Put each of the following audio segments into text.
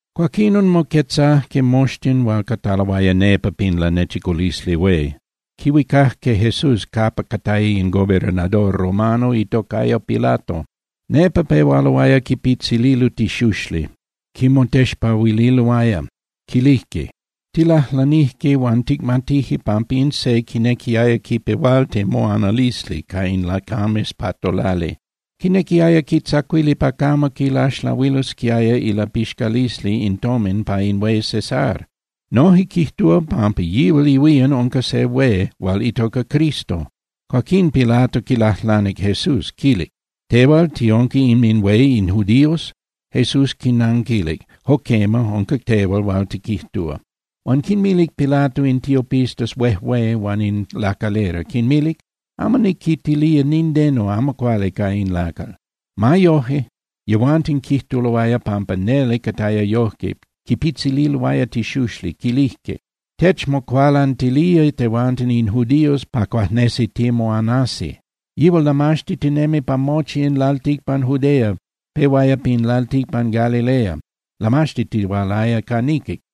Cuaquinon moquetzajque moxtin hual cataloaya nepa pin Lanechiculisli Hué, quihuicajque Jesús capa cataya in gobernador romano itocaya Pilato. Nepa pehualoaya quipitzililo tixuxli, quimotexpahuililoaya, quilijque: —Tilajlanije huan ticmatije pampa in se quinequiaya quipehualti moanalisli ca in lacames pa tolali. Quinequiaya quitzacuili pa camo quilaxlahuilosquiaya ilapixcalisli in tomin pa in hué César. Noje quijtúa pampa yihual ihuían unca se hué hual itoca Cristo. Cuaquín Pilato quilajlanic Jesús, quilic: —¿Tehual tiunca inminhué in judíos? Jesús quinanquilic: —Jo quema, unca tehual hual tiquijtúa. Huan quinmilic Pilato in tiopistas huejué huan in lacalera, quinmilic: —Amo niquitilía nindeno amo cuali ca in lacal. Ma yoje, yehuanten quijtuloaya pampa neli cataya yojque, quipitzililoaya tixuxli, quilijque: —Techmocualantilía tehuanten in judíos pa cuajnesi timoanasi. Yihual lamaxtitinemi pa mochi in lalticpan Judea, pehuaya pin lalticpan Galilea, lamaxtitihualaya ca niquic.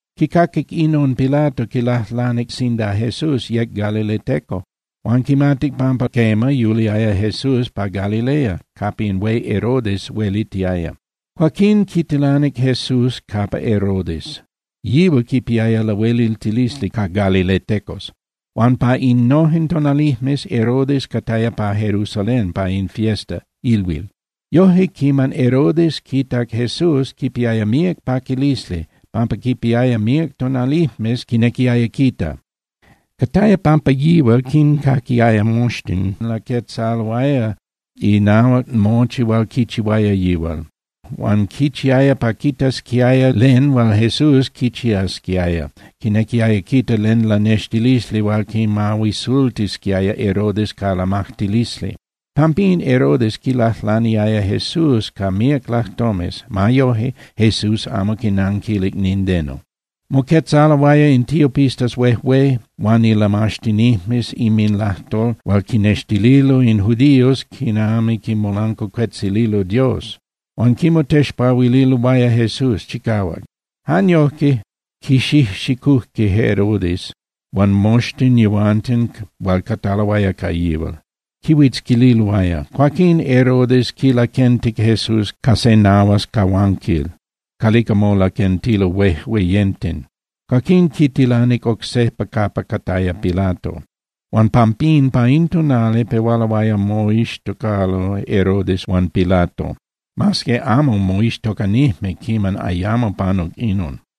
Quicaquic inon Pilato, quilajlanic sinda Jesús yec galileteco. Huan quimatic pampa quema, yuliaya Jesús pa Galilea capa in hué Herodes huelitiaya. Cuaquín quitilanic Jesús capa Herodes, yihual quipiaya lahueliltilisli ca galiletecos. Huan pa innojen tonalijmes, Herodes cataya pa Jerusalén pa in fiesta (ilhuil). Yoje, quiman Herodes quitac Jesús, quipiaya míac paquilisli, pampa quipiaya míac tonalijmes quinequiaya quita. Cataya pampa yihual quincaquiaya moxtin laquetzaloaya inahuac mochi hual quichihuaya yihual. Huan quichiaya pa quitasquiaya len hual Jesús quichiasquiaya, quinequiaya quita len lanextilisli hual quimahuisultisquiaya Herodes ca lamajtilisli. Pampín Herodes quilajlaniaya Jesús ca míac lajtomes. Ma yoje, Jesús amo quinanquilic nindeno. Moquetzaloaya in tiopistas huejué huan ilamaxtinijmes inminlajtol hual quinnextililo in judíos quinami quimolancuacuetzililo Dios, huan quimotexpahuililoaya Jesús chicahuac. Jan yojque, quixijxicujque Herodes huan moxtin yehuanten hual cataloaya ca yihual, quihuitzquililoaya. Cuaquinon Herodes quilaquentic Jesús ca se nahuas cahuanquil calica molaquentilo huejueyenten. Cuaquín quitilanic oc sejpa capa cataya Pilato. Huan pampín pa in tonali pehualoaya moixtocalo Herodes huan Pilato, mas que amo moixtocanijme quiman ayamo panuc inon.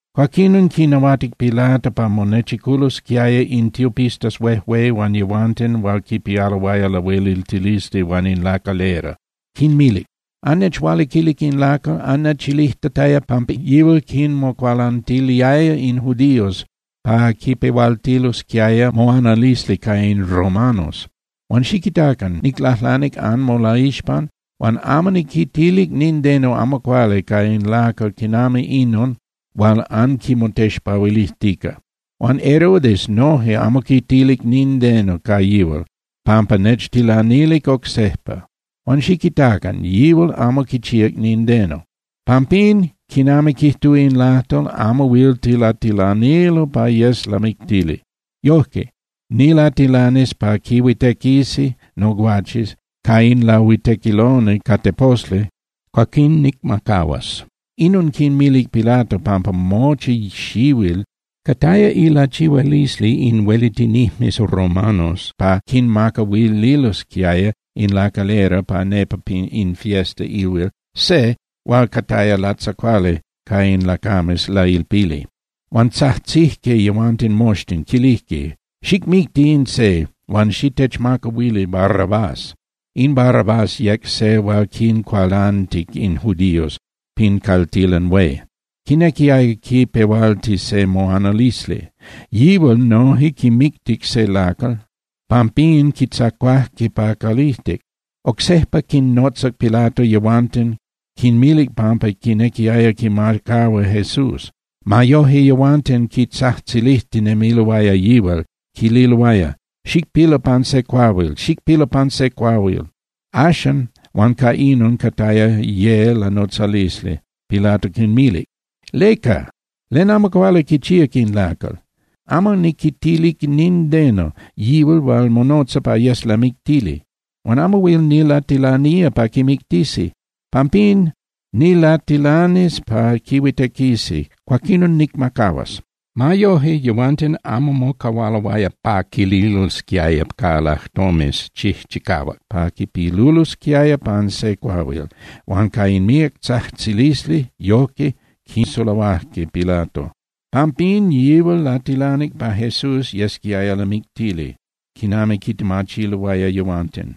Cuaquinon quinahuatic Pilato pa monechiculosquiaya in tiopistas huejué huan yehuanten hual quipialoaya lahueliltilisli huan in lacalera. Quinmilic: —Annechualiquilic in lacal, annechilijtataya pampa yihual quinmocualantiliaya in judíos pa quipehualtilosquiaya moanalisli ca in romanos. Huan xiquitacan, niclajlanic anmolaixpan huan amo niquitilic nindeno amo cuali ca in lacal quinami inon hual anquimotexpahuilijtica. Huan Herodes noje amo quitilic nindeno ca yihual pampa nechtilanilic oc sejpa. Huan xiquitacan, yihual amo quichíac nindeno. Pampín, quinami quijtúa in lajtol, amo huil tilatilanilo pa yes lamictili. Yoje, nilatilanis pa quihuitequisi noguaches ca in lahuitequiloni ca teposli, cuaquín nicmacahuas. Inon quinmilic Pilato pampa mochi xihuil cataya ilachihualisli in huelitinijmes romanos pa quinmacahuililosquiaya in lacalera pa nepa in fiesta (ilhuil) se hual cataya latzacuali ca in lacames lailpili. Huan tzajtzijque yehuanten moxtin, quilijque: —¡Xicmicti in se, huan xitechmacahuili Barrabás! In Barrabás yec se hual quincualantic in judíos pin caltilan hué. Quinequiaya quipehualti se moanalisli. Yihual noje quimictic se lacal, pampín quitzacuajque pa calijtic. Oc sejpa quinnotzac Pilato yehuanten, quinmilic pampa quinequiaya quimacahua Jesús. Ma yoje, yehuanten quitzajtzilijtinemiloaya yihual, quililoaya: —¡Xicpilu pan se cuahuil, xicpilu pan se cuahuil! Axan, huan ca inon cataya ye lanotzalisli, Pilato quinmilic: —¿Leca? ¿Len amo cuali quichíac in lacal? Amo niquitilic nindeno yihual hual monotza pa yes lamictili, huan amo huil nilatilanía pa quimictisi. Pampín, nilatilanis pa quihuitequisi, cuaquinon nicmacahuas. Ma yoje, yehuanten amo mocahualoaya pa quililosquiaya ca lajtomes chijchicahuac pa quipilulosquiaya pan se cuahuil, huan ca in míac tzajtzilisli, yojque quisulahuajque Pilato. Pampín yihual latilanic pa Jesús yesquiaya lamictili quinami quitemachiloaya yehuanten.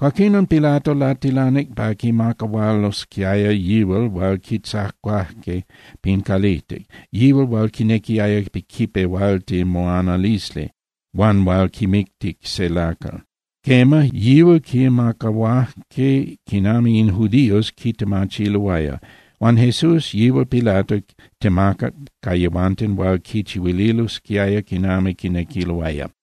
Cuaquinon, Pilato latilanic pa quimacahualosquiaya yihual hual quitzacuajque pin calijtic, yihual hual quinequiaya quipehualti moanalisli huan hual quimictic se lacal. Quema, yihual quimacahuajque quinami in judíos quitemachiloaya. Huan Jesús, yihual Pilato temacac ca yehuanten pa quichihuililosquiaya quinami quinequiloaya.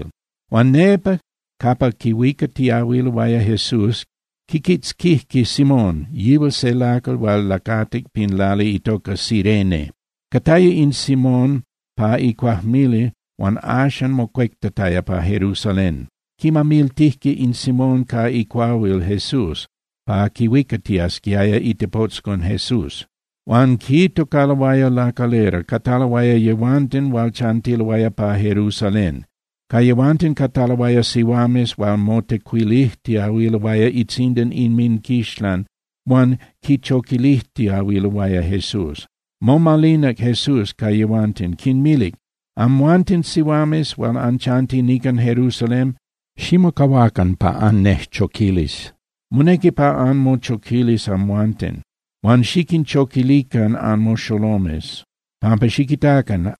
Huan nepa capa quihuicatiahuiloaya Jesús, quiquitzquijque Simón, yihual se lacal hual lacatic pin lali itoca Cirene. Cataya in Simón pa icuajmili huan axan mocuectataya pa Jerusalén. Quimamiltijque in Simón ca icuahuil Jesús pa quihuicatiasquiaya itepotzcon Jesús. Huan quitocaloaya lacalera, cataloaya yehuanten hual chantiloaya pa Jerusalén. Ca yehuanten cataloaya sihuames hual motecuilijtiahuiloaya itzindan inminquixlan huan quichoquilijtiahuiloaya Jesús. Momalinac Jesús ca yehuanten, quinmilic: —Amhuanten sihuames hual anchanti nican Jerusalén, ximocahuacan pa annejchoquilis. Monequi pa anmochoquilis amhuanten. Huan xiquinchoquilican anmoxolomes, pampa xiquitacan: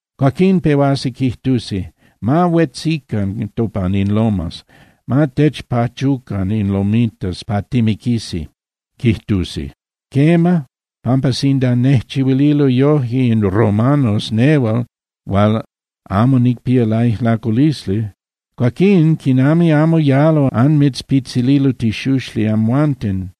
Cuaquín pehuasi quijtusi: “¡Ma huetzican topan in lomas! ¡Ma techpachucan in lomitas pa timiquisi!”, quijtusi. Quema, pampa sinda nejchihuililo yoje in romanos nehual hual amo nicpía laijlaculisli, cuaquín ¡quinami amo yalo anmitzpitzililo tixuxli amhuanten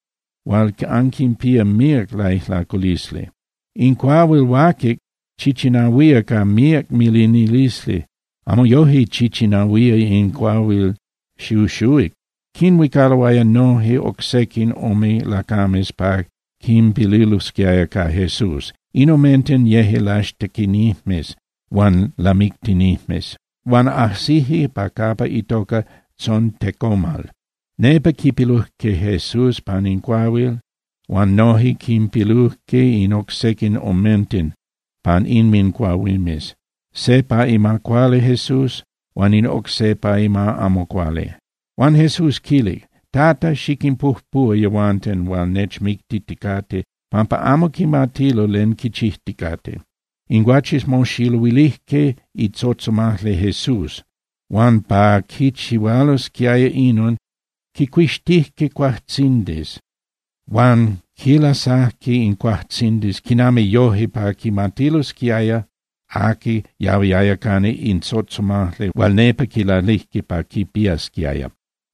hual anquinpía míac laijlaculisli! In cuahuil huaquic chichinahuía ca míac milinilisli, amo yoje chichinahuía in cuahuil xuxuhuic. Quinhuicaloaya noje oc sequin ome lacames pa quinpilulosquiaya ca Jesús, in omenten yeje laixtequinijmes huan lamictinijmes. Huan ajsijque pa capa itoca Tzontecomal, nepa quipilujque Jesús pan in cuahuil huan noje quinpilujque in oc sequin omenten pan inmincuahuimes, se pa ima cuali Jesús huan in oc se pa ima amo cuali. Huan Jesús quilic: —Tata, xiquinpujpuhua yehuanten hual nechmictiticate, pampa amo quimatilo len quichijticate. In guaches moxiluilijque itzotzomajli Jesús huan pa quichihualosquiaya inon, quicuixtijque cuajtzindis, huan quinlasajque in cuajtzindis quinami yoje pa quimatilosquiaya aqui yahuiaya cana in tzotzomajli hual nepa quilalijque pa quipiasquiaya.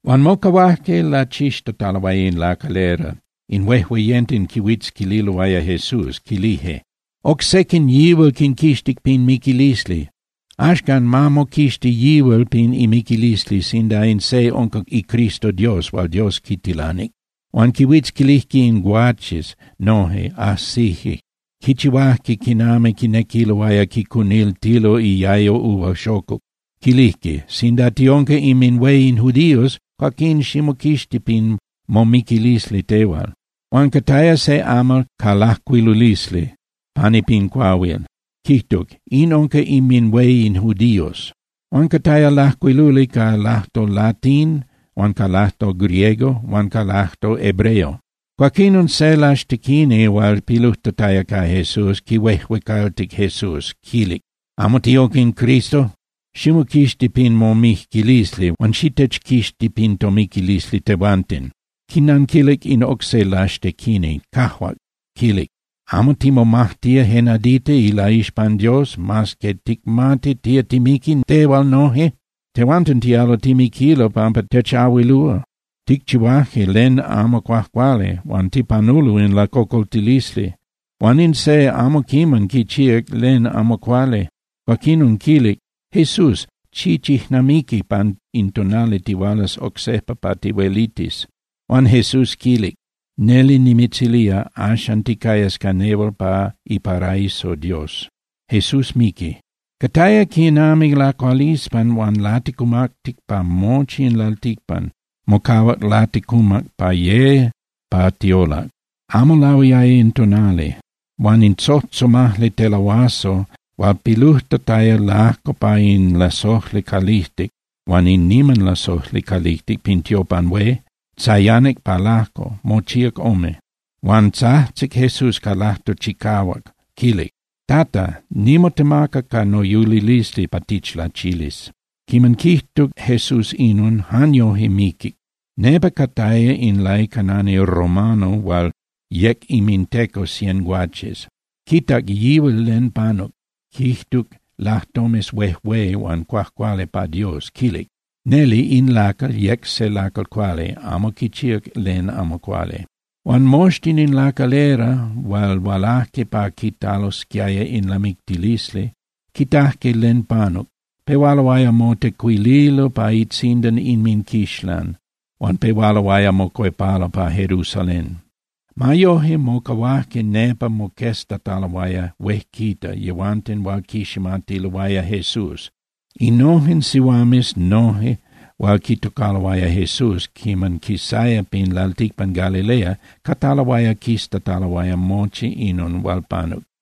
Huan mocahuajque lachixtataloaya in lacalera. In huejueyenten quihuitzquililoaya Jesús, quilijque: —Oc sequin yihual quinquixtic pin miquilisli. Axcan, ma moquixti yihual pin imiquilisli sinda in se unca iCristo Dios hual Dios quitilanic. Huan quihuitzquilijque in guaches noje, ajsijque, quichihuajque quinami quinequiloaya quicuniltilo iayo uva xocuc. Quilijque: —Sinda tiunca inminhué in judíos, cuaquín ximoquixti pin momiquilisli tehual. Huan cataya se amal ca lajcuilulisli pani pin cuahuil, quijtuc: “IN UNCA INMINHUÉ IN JUDÍOS.” Huan cataya lajcuiluli ca lajtol latín huan ca lajtol griego huan ca lajtol hebreo. Cuaquinon, se laxtequini hual pilujtataya ca Jesús, quihuejuecaltic Jesús, quilic: —¿Amo tiunca in Cristo? Ximoquixti pin momiquilisli huan xitechquixti pin tomiquilisli tehuanten. Quinanquilic in oc se laxtequini, cajuac, quilic: —¿Amo timomajtía je nadita ilaixpan Dios, mas que ticmati tía timiqui tehual noje? Tehuanten tialo timiquilo pampa techahuilúa, ticchihuaje len amo cuajcuali huan tipanulo in lacocoltilisli. Huan in se amo quiman quichíac len amo cuali. Cuaquinon quilic: —Jesús, xichijnamiqui pan in tonali tihualas oc sejpa pa tihuelitis. Huan Jesús quilic: —Neli nimitzilía, axan ticayas ca nehual pa iparaiso Dios. Cataya quinami lacualispan huan laticumactic pa mochi in lalticpan, mocahuac laticumac pa ye pa tiolac, amo lahuiaya in tonali. Huan in tzotzomajli telahuazo hual pilujtataya lajco pa in lasojli calijtic huan in niman lasojli calijtic pin tiopan hué, tzayanic pa lajco, mochíac ome. Huan tzajtzic Jesús ca lajtol chicahuac, quilic: —Tata, nimotemaca ca noyulilisli pa tichlachilis. Quiman quijtuc Jesús inon, jan yoje miquic. Nepa cataya in laicanani romano hual yec inminteco cien guaches. Quitac yihual len panuc, quijtuc lajtomes huejué huan cuajcuali pa Dios, quilic: —Neli in lacal yec se lacal cuali, amo quichíac len amo cuali. Huan moxtin in lacalera hual hualajque pa quitalosquiaya in lamictilisli, quitajque len panuc, pehualoaya motecuililo pa itzindan inminquixlan huan pehualoaya mocuepalo pa Jerusalén. Ma yoje, mocahuajque nepa moqueztataloaya huejquita yehuanten hual quiximatiloaya Jesús. Innojen sihuames noje hual quitocaloaya Jesús quiman quisaya pin lalticpan Galilea cataloaya quiztataloaya mochi inon hual panuc.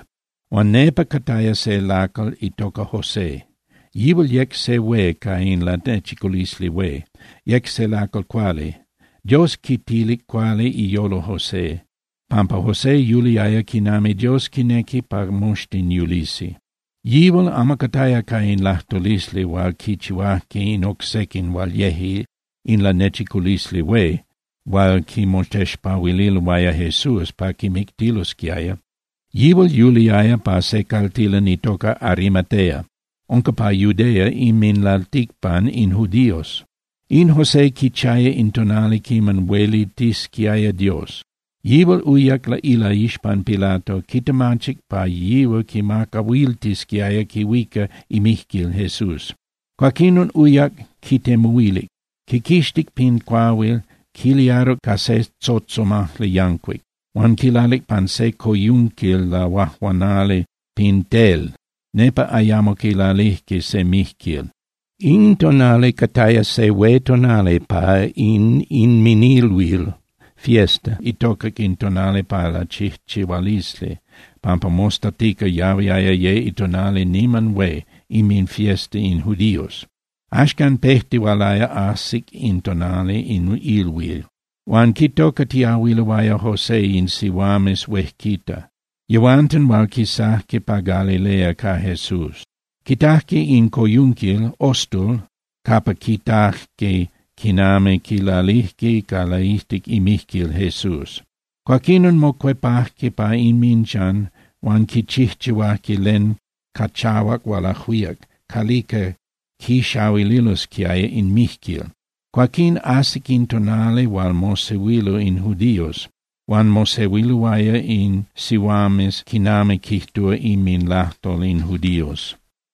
Huan nepa cataya se lacal itoca José. Yihual yec se hué ca in Lanechiculisli Hué, yec se lacal cuali. Dios quitilic cuali iyolo José, pampa José yuliaya quinami Dios quinequi pa moxtin yulisi. Yihual amo cataya ca in lajtulisli hual quichihuajque in oc sequin hual yeje in Lanechiculisli Hué hual quimotexpahuililoaya Jesús pa quimictilosquiaya. Yihual yuliaya pa se caltilan itoca Arimatea, unca pa Judea inminlalticpan in judíos. In José quichiaya in tonali quiman huelitisquiaya Dios. Yihual uyac ilaixpan Pilato, quitemachic pa yihual quimacahuiltisquiaya quihuica imijquil Jesús. Cuaquinon uyac quitemuhuilic, quiquixtic pin cuahuil, quiliaruc ca se tzotzomajli yancuic, huan quilalic pan se coyunquil lahuajuanali pin tel, nepa ayamo quilalijque se mijquil. In tonali cataya se hué tonali pa in inminilhuil (fiesta), itocac in tonali pa lachijchihualisli pampa mostatica yahuiaya ye itonali niman hué inminfiesta in judíos. Axcan pejtihualaya ajsi in itonali in ilhuil. Huan quitocatiahuiloaya José in sihuames huejquita, yehuanten hual quisajque pa Galilea ca Jesús. Quitajque in coyunquil (ostul) huan quitajque quinami quilalijque ca laijtic imijquil Jesús. Cuaquinon mocuepajque pa inminchan huan quichijchihuajque len ca chahuac hual ajuíac calica quixahuililosquiaya in mijquil. Cuaquín ajsic in tonali hual mosehuilo in judíos huan mosehuiloaya in sihuames quinami quijtúa inminlajtol in judíos.